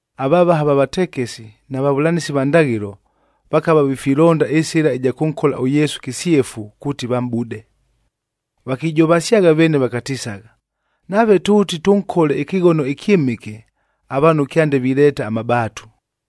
avavaha va vatekesi na vavʉlanɨsi va ndaghɨlo, vakava vifilonda ɨsɨla ɨja kʉnkola ʉYesu kɨsyefu kuuti vamʼbude. Vakijovasyagha veene vakatisagha, “Nave tʉʉti tʉnkole ɨkɨghono ɨkyɨmɨke, avaanhu kyande vileeta amabaatu.”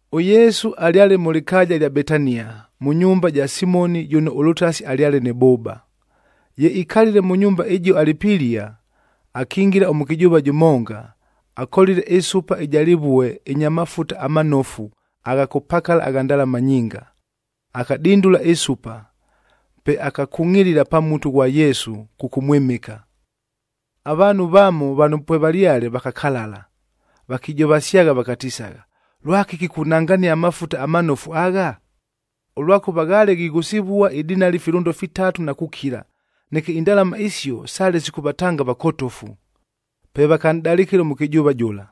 ɄYesu alyale mʉ lɨkaaja ɨlya Betania, mʉ nyumba ja Simoni jʉno ʉlʉtasi alyale nɨ bʉʉba. Ye ikalile mʉ nyumba ɨjio alɨ pilia, akingila ʉmʉkɨjʉʉva jʉmonga, akolile ɨsupa ɨja lɨvueb ɨnya mafuta amanofu agha kʉpakala agha ndalama nyinga. Akadindula ɨsupa, pe akakungʼilila pa mutu ghwa Yesu kʉkʉmwɨmɨka. Avaanhu vamo vano pwevalyale vakakalala, vakijovasyagha vakatisagha, “Lwakɨki kunangania amafuta amanofu agha? Ʉlwakʉva ghaale ghighʉsɨvua idinali filʉndo fitatuc na kukila, neke indalama isio sale sikʉvatanga avakotofu.” Pe vakanʼdalɨkɨla ʉmʉkɨjʉʉva jʉla.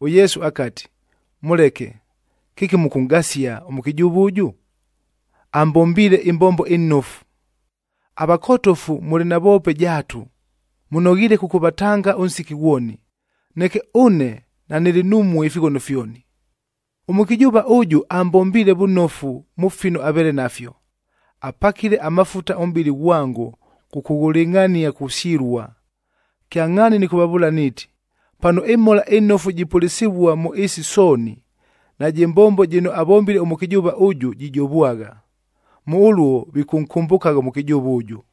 ɄYesu akati, “Mʉleke, kɨki mʉkʉnʼgasia ʉmʉkɨjʉʉva ʉjʉ? Ambombiile ɨmbombo ɨnofu. Avakotofu mʉlɨ navoope jaatu, mʉnoghiile kʉkʉvatanga ʉnsiki ghwoni. Neke ʉne, nanɨlɨ numue ifighono fyoni. Ʉmʉkɨjʉʉva ʉjʉ ambombiile vʉnofu mʉ fino aveele nafyo, apakile amafuta ʉmʼbɨlɨ ghwango kʉkʉghʉlɨngʼhania kusyɨlua. Kyangʼhaani nɨkʉvavʉʉla niiti, pano ɨMhola ɨNofu jipʉlɨsɨvua mʉ ɨɨsi sooni, najɨ mbombo jɨno avombile ʉmʉkɨjʉʉva ʉjʉ, jijovwagha. Mʉ ʉluo vikʉnkʉmbʉkagha ʉmʉkɨjʉʉva ʉjʉ.”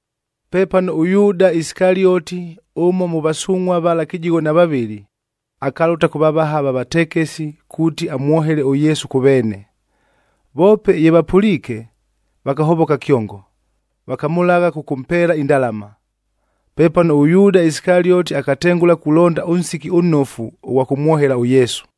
Pepano ʉYuuda Isikalioti, ʉmo mʉ vasungʼhua vala kɨjigho na vavɨlɨ, akalʉta kʉ vavaha va vatekesi kuuti amwohele ʉYesu kʉ veene. Voope ye vapʉliike, vakahovoka kyongo, vakamʉlagha kʉkʉmpeela indalama. Pepano ʉYuuda Isikalioti akatengʉla kulonda ʉnsiki ʉnnofu ʉghwa kʉmwohela ʉYesu.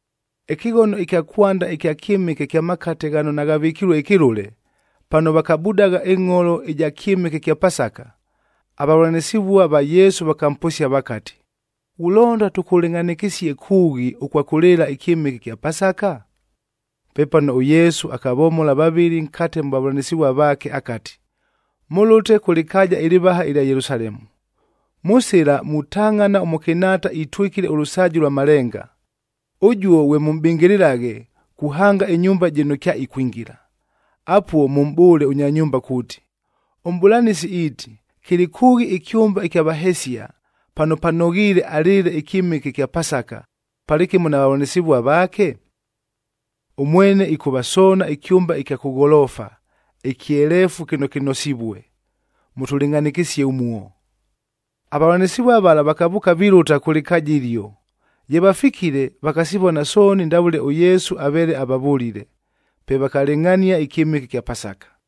Ɨkɨghono ɨkya kwanda ɨkya kyɨmɨke kya makate ghano naghavɨkilue ɨkɨlʉle,d pano vakabudagha ɨngʼholo ɨja kyɨmɨke kya Pasaka, avavʉlanɨsɨvua va Yesu vakamposia vakati, “Ghulonda tʉkʉlɨngʼhanɨkɨsie kʉʉghi ʉkwa kʉlɨɨla ɨkyɨmɨke ɨkya Pasaka?” Pepano ʉYesu akavomola vavɨlɨ nkate mʉ vavʉlanɨsɨvua vaake, akati, “Mʉlʉte kʉ lɨkaaja ɨlɨvaha ɨlya Yelusalemu, mʉ sɨla mutangʼhana ʉmʉkɨnhaata itwɨkile ʉlʉsaaji lwa malenga. Ʉjuo ghwe mʉmʼbɨngɨlɨlaghe, kuhanga ɨnyumba jɨno kyaikwingila. Apuo, mʉmʼbʉʉle ʉnya nyumba kuuti, ‘ɄMʼbʉlanɨsi iiti, kɨlɨ kʉʉghi ɨkyʉmba ɨkya vahesia, pano panoghiile alɨɨle ɨkyɨmɨke ɨkya Pasaka, palɨkɨmo na vavʉlanɨsɨvua vaake?’ Ʉmwene ɨkʉvasoona ɨkyʉmba ɨkya kʉ gholoofa, ɨkyeleefu kɨno kɨnosivue. Mʉtʉlɨngʼhanɨkɨsie ʉmuo.” Avavʉlanɨsɨvua vala vakavʉʉka vilʉta kʉ lɨkaaja ɨlio. Ye vafikile, vakasivona sooni ndavʉle ʉYesu aveele avavʉlile. Pe vakalɨngʼhania ɨkyɨmɨke ɨkya Pasaka.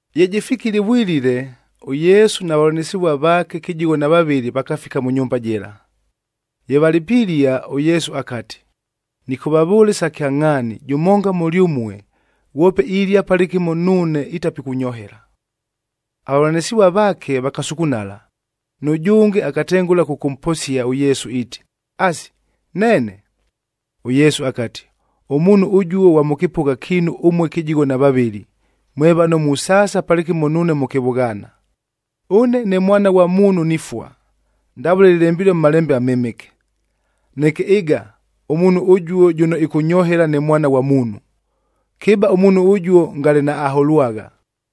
Ye jɨfikile ɨvwilile, ʉYesu na vavʉlanɨsɨvua vaake kɨjigho na vavɨlɨ vakafika mʉ nyumba jɨla. Ye valɨ pilia, ʉYesu akati, “Nɨkʉvavʉʉla isa kyangʼhaani, jʉmonga mʉlyʉmue, ghwope ilia palɨkɨmo nuune, itapikʉnyohela.” Avavʉlanɨsɨvua vaake vakasukunala, nʉjʉnge akatengʉla kʉkʉmposia ʉYesu iiti, “Asi, neene?” ɄYesu akati, “Ʉmuunhu ʉjuo ghwa mʉ kɨpʉgha kiinu ʉmue kɨjigho na vavɨlɨ, mwe vano musaasa palɨkɨmo nuune mʉ kɨvʉghaana. Ʉne ne Mwana ghwa Muunhu nifua, ndavʉle lɨlembilue mʉ Malembe aMɨmɨke. Neke ɨga, ʉmuunhu ʉjuo jʉno ɨkʉnyohela ne Mwana ghwa Muunhu! Kɨba ʉmuunhu ʉjuo, ngale naaholwagha.”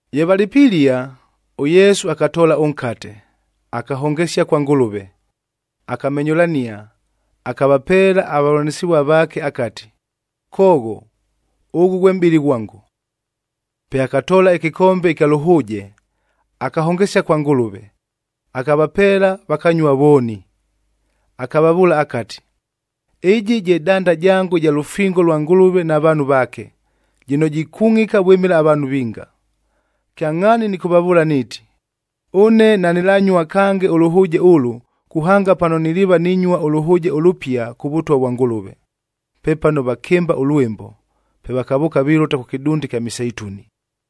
Ye valɨ pilia, ʉYesu akatoola ʉnkate, akahongesia kwa Ngʉlʉve, akamenyʉlania, akavapeela avavʉlanɨsɨvua vaake akati, “Koogho, ʉghʉ ghwe mʼbɨlɨ ghwango.” Pe akatoola ɨkɨkombe ɨkya lʉhʉʉje, akahongesia kwa Ngʉlʉve, akavapeela, vakanyua vooni. Akavavʉʉla akati, “Ɨjɨ je danda jango ɨja lʉfingoe lwa Ngʉlʉvef na vaanhu vaake, jɨno jikungʼika vwɨmɨla avaanhu vinga. Kyangʼhaani nɨkʉvavʉʉla niiti, ʉne nanɨlanyua kange ʉlʉhʉʉje ʉlʉ, kuhanga pano niliiva ninyua ʉlʉhʉʉje ʉlʉpia kʉ Vʉtwa vwa Ngʉlʉve.” Pepano vakɨmba ʉlwɨmbo,g pe vakavʉʉka vilʉta kʉ kɨdunda ɨkya Miseituni.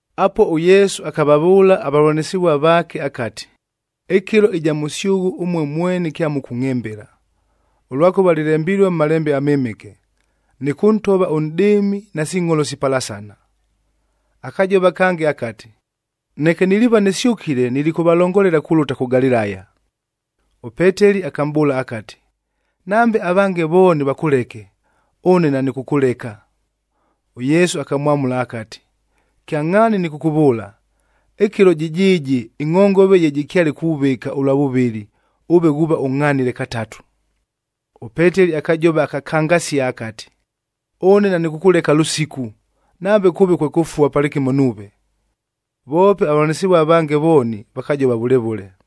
Apuo ʉYesu akavavʉʉla avavʉlanɨsɨvua vaake akati, “Ɨkɨlo ɨja mʉsyʉghʉ ʉmue mweni kyamʉkʉngʼhɨmbɨla, ʉlwakʉva lɨlembilue mʉ Malembe aMɨmɨke, ‘Nɨkʉntova ʉnʼdɨɨmi, nasi ngʼholo sipalasana.’h” Akajova kange akati, “Neke niliiva nɨsyʉkile nilikʉvalongolela kulʉta kʉ Galilaya.” ɄPeteli akamʼbʉʉla akati, “Nambe avange vooni vakʉleke, ʉne nanɨkʉkʉleka!” ɄYesu akamwamʉla akati, “Kyangʼhaani nɨkʉkʉvʉʉla, ɨkɨlo jɨjɨɨjɨ ɨngʼhongove ye jɨkyale kuvɨka ʉlwa vʉvɨlɨ, ʉve ghuuva ʉngʼhanile katatu.” ɄPeteli akajova akakangasia akati, “Ʉne nanɨkʉkʉleka lʉsiku, nambe kʉʉve kwe kʉfua palɨkɨmo nuuve.” Voope avavʉlanɨsɨvua avange vooni vakajova vʉle vʉle.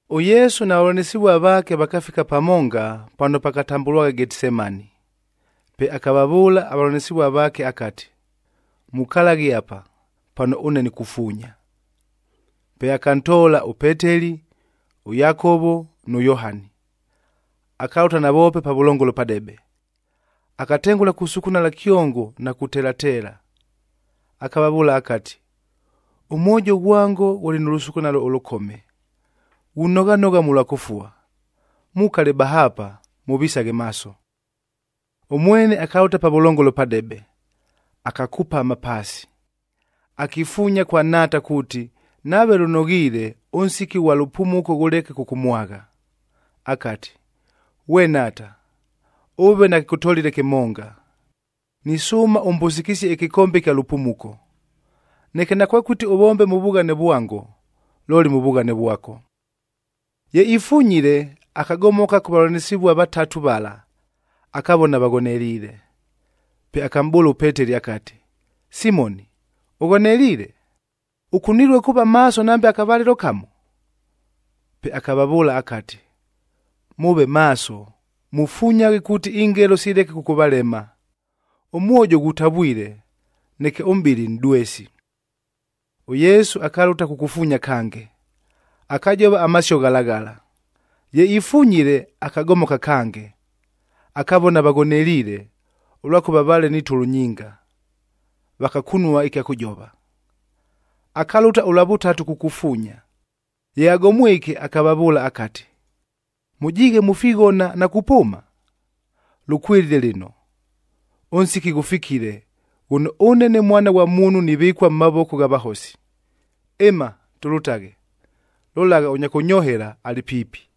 ɄYesu na vavʉlanɨsɨvua vaake vakafika pamonga, pano pakatambʉlwagha Getisemani. Pe akavavʉʉla avavʉlanɨsɨvua vaake akati, “Mukalaghe apa, pano ʉne nikufuunya.” Pe akantoola ʉPeteli, ʉYakovo nʉ Yohani, akalʉta navoope pavʉlongolo padebe. Akatengʉla kusukunala kyongo na kutelateela. Akavavʉʉla akati, “Ʉmwojo ghwango ghʉlɨ nʉ lʉsukunalo ʉlʉkome, ghunoghanogha mʉlwa kʉfua. Mukale bahaapa, mʉvisaghe maaso.” Ʉmwene akalʉta pavʉlongolo padebe, akakupama paasi, akifuunya kwa Nhaata kuuti, nave lʉnoghiile, ʉnsiki ʉghwa lʉpumuko ghʉleke kʉkʉmwagha. Akati, “Ghwe Nhaata, ʉve nakɨkʉtolile kɨmonga. Nisʉʉma ʉmbʉsɨkɨsie ɨkɨkombe ɨkya lʉpumuko. Neke nakwekʉti ʉvombe mʉ vughane vwango, looli mʉ vughane vwako.” Ye ifunyile, akagomoka kʉ vavʉlanɨsɨvua vatatu vala, akavona vaghoneliile. Pe akamʼbʉʉla ʉPeteli akati, “Simoni, ʉghoneliile? Ʉkunilue kuuva maaso nambe akavalɨlo kamo?” Pe akavavʉʉla akati, “Mʉʉve maaso, mufunyaghe kuuti ingelo sileke kʉkʉvalema. Ʉmwojo ghutavwile, neke ʉmʼbɨlɨ nʼdwesi.” ɄYesu akalʉta kukufuunya kange, akajova amasio ghala ghala. Ye ifunyile, akagomoka kange, akavona vaghoneliile, ʉlwakʉva vaale ni tʉlʉ nyinga. Vakakunua ɨkya kʉjova. Akalʉta ʉlwa vʉtatu kukufuunya. Ye agomwike, akavavʉʉla akati, “Mʉjiighe mufighona na kupʉʉma? Lʉkwɨlile lɨno! Ʉnsiki ghʉfikile ghʉno ʉne ne Mwana ghwa Muunhu nivɨkua mʉ mavoko gha vahosi. Ɨma, tʉlʉtaghe! Lolagha, ʉnya kʉnyohela alɨ piipi.”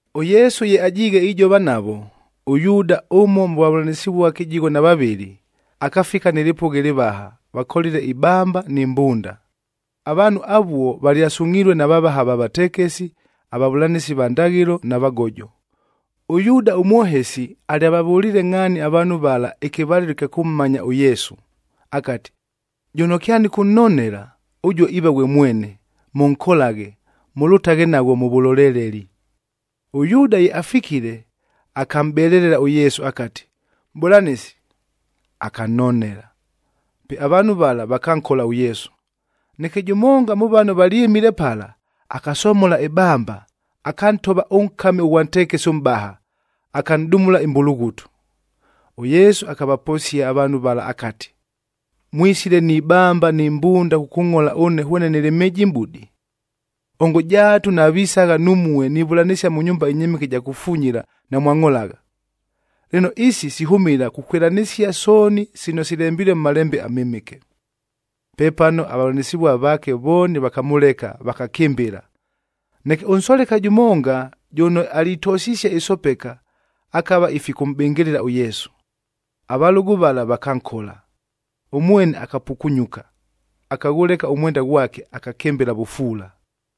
ɄYesu ye ajiighe ijova navo, ʉYuuda ʉmo mʉ vavʉlanɨsɨvua kɨjigho na vavɨlɨ, akafika nɨ lɨpʉgha ɨlɨvaha, vakolile ibamba ni mbunda. Avaanhu avuo valyasungʼhilue na vavaha va vatekesi, avavʉlanɨsi va ndaghɨlo na vagojo. ɄYuuda ʉmwohesi alyavavʉliile ngʼhaani avaanhu vala ɨkɨvalɨlo ɨkya kʉmmanya ʉYesu, akati, “Jʉno kyanɨkʉnnonela, ʉjuo iiva ghwe mwene, mʉnkolaghe, mʉlʉtaghe naghwo mʉ vʉloleleli.” ɄYuuda ye afikile, akamʼbelelela ʉYesu akati, “Mʼbʉlanɨsi.” Akannonela. Pe avaanhu vala vakankola ʉYesu. Neke jʉmonga mʉ vano valyɨmile pala, akasomola ɨbamba, akantova ʉnkami ʉghwa ntekesi ʉmʼbaha, akanʼdumula ɨmbulughutu. ɄYesu akavaposia avaanhu vala akati, “Mwisile ni bamba ni mbunda kʉkʉngʼhola ʉne hwene nɨlɨ mhɨjimʼbudi! Ongo jaatu navisagha numue nivʉlanɨsia mʉ nyumba ɨnyɨmɨke ɨja kufunyila, namwangʼholagha! Lɨno, isi sihʉmɨla kukwɨlanɨsia sooni sino silembilue mʉ Malembe aMɨmɨke.” Pepano avavʉlanɨsɨvua vaake vooni vakamʉleka, vakakɨmbɨla. Neke ʉnsoleka jʉmonga jʉno alitosisie ɨsopeka, akava ifikʉmʼbɨngɨlɨla ʉYesu. Avalʉgʉ vala vakankola, ʉmwene akapukunyuka, akaghʉleka ʉmwenda ghwake, akakɨmbɨla vʉfuula.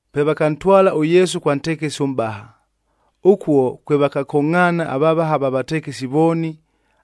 Pe vakantwala ʉYesu kwa ntekesi ʉmʼbaha.i Ʉkuo kwe vakakongʼhaana avavaha va vatekesi vooni,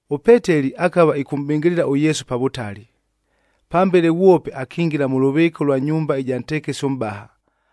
ɄPeteli akava ɨkʉmʼbɨngɨlɨla ʉYesu pa vʉtali. Pambele ghwope akingila mʉ lʉvɨɨka ʉlwa nyumba ɨja ntekesi ʉmʼbaha,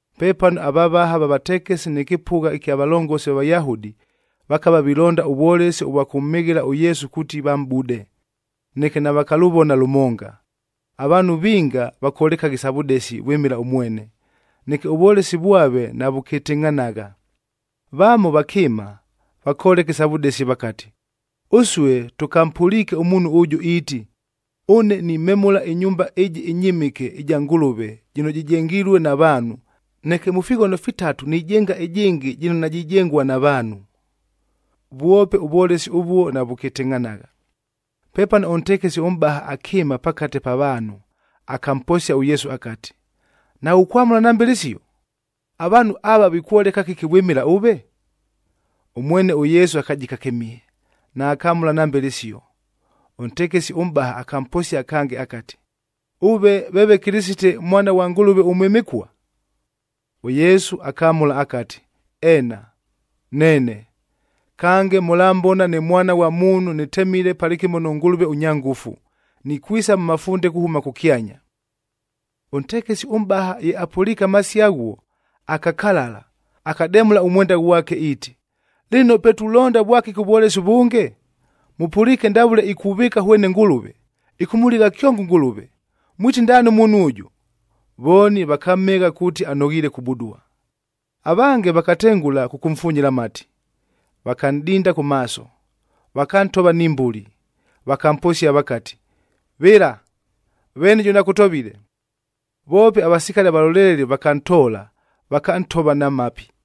Pepano avavaha va vatekesi nɨ kɨpʉgha kya valongosil va Vayahudi, vakava vilonda ʉvwolesi ʉvwa kʉmhɨghɨla ʉYesu kuuti vamʼbude, neke navakalʉvona lʉmonga. Avaanhu vinga vakolekagha isa vʉdesi vwɨmɨla ʉmwene, neke ʉvwolesi vwave navʉkɨtɨngʼhanagha. Vamo vakɨɨma, vakoleka isa vʉdesi vakati, “Ʉsue tʉkampʉliike ʉmuunhu ʉjʉ iiti, ‘Ʉne nimemʉla ɨnyumba ɨjɨ ɨnyɨmɨke ɨja Ngʉlʉvem jɨno jɨjengilue na vaanhu, neke mʉ fighono fitatu nijenga ɨjɨngɨ jɨno najijengua na vaanhu.’” Vwope ʉvwolesi ʉvuo navʉkɨtɨngʼhanagha. Pepano ʉntekesi ʉmʼbaha akɨɨma pakate pa vaanhu, akamposia ʉYesu akati, “Naghukwamʉla nambe lɨsio? Avaanhu ava vikwoleka kɨki vwɨmɨla ʉve?” Ʉmwene ʉYesu akajika kɨmihe, naakamʉla nambe lɨsio. Ʉntekesi ʉmʼbaha akamposia kange akati, “Ʉve veeve Kɨlɨsite, Mwana ghwa Ngʉlʉve ʉMwɨmɨkua?” ɄYesu akamʉla akati, “Eena, neene. Kange, mʉlambona ne Mwana ghwa Muunhu nɨtemile palɨkɨmo nʉ Ngʉlʉve ʉnya ngʉfu, nikwisa mʉ mafunde kuhʉma kʉkyanya.” Ʉntekesi ʉmʼbaha ye apʉliike amasio aghuo, akakalala, akademʉla ʉmwenda ghwake iiti, “Lɨno pe tulonda vwakɨki ʉvwolesi ʉvʉnge? Mʉpʉliike ndavʉle ikuvɨɨka hwene Ngʉlʉve, ɨkʉmʉligha kyongo ʉNgʉlʉve! Mwiti ndaani ʉmuunhu ʉjʉ?” Vooni vakamhɨgha kuuti anoghiile kubudua. Avange vakatengʉla kʉkʉmfunyila amati, vakanʼdinda kʉ maaso, vakantova ni mbuli, vakamposia vakati, “Vɨla, veeni jʉno akʉtovile!” Voope avasikali avaloleleli vakantoola, vakantova na mapi.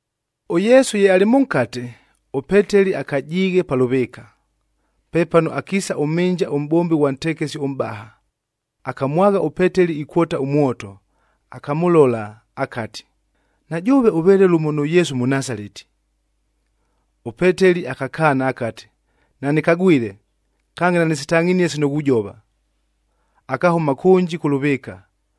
ɄYesu ye alɨ mʉnkate, ʉPeteli akajiighe pa lʉvɨɨka. Pepano akiisa ʉmhɨnja ʉmʼbombi ghwa ntekesi ʉmʼbaha. Akamwagha ʉPeteli ikwota ʉmwoto, akamʉlola, akati, “Na jʉʉve ʉveele lʉmo nʉ Yesu ʉMʉnasaleti!” ɄPeteli akakaana akati, “Nanɨkagwile, kange nanɨsitangʼhinie sino ghujova!” Akahʉma kʉnji kʉ lʉvɨɨka.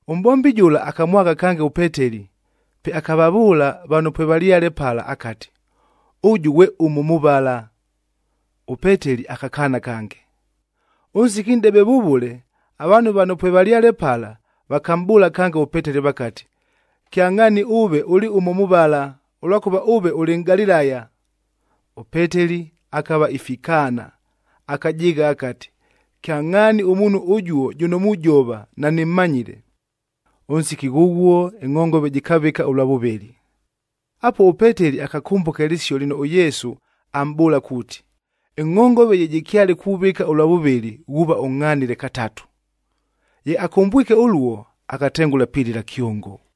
Ʉmʼbombi jʉla akamwagha kange ʉPeteli, pe akavavʉʉla vano pwevalyale pala akati, “Ʉjʉ ghwe ʉmo mʉ vala.” ɄPeteli akakaana kange. Ʉnsiki nʼdebe vʉvʉle, avaanhu vano pwevalyale pala vakamʼbʉʉla kange ʉPeteli vakati, “Kyangʼhaani ʉve ʉlɨ ʉmo mʉ vala, ʉlwakʉva ʉve ʉlɨ Nʼgalilaya.” ɄPeteli akava ifikaana, akajɨɨgha akati, “Kyangʼhaani ʉmuunhu ʉjuo jʉno mujova, nanɨmmanyile!” Ʉnsiki ghʉghuo ɨngʼhongove jɨkavɨka ʉlwa vʉvɨlɨ. Apuo ʉPeteli akakʉmbʉka ɨlɨsio lɨno ʉYesu amʼbʉʉla kuuti, “Ɨngʼhongove ye jɨkyale kuvɨka ʉlwa vʉvɨlɨ, ghuuva ʉngʼhanile katatu.” Ye akʉmbwike ʉluo, akatengʉla pilɨla kyongo.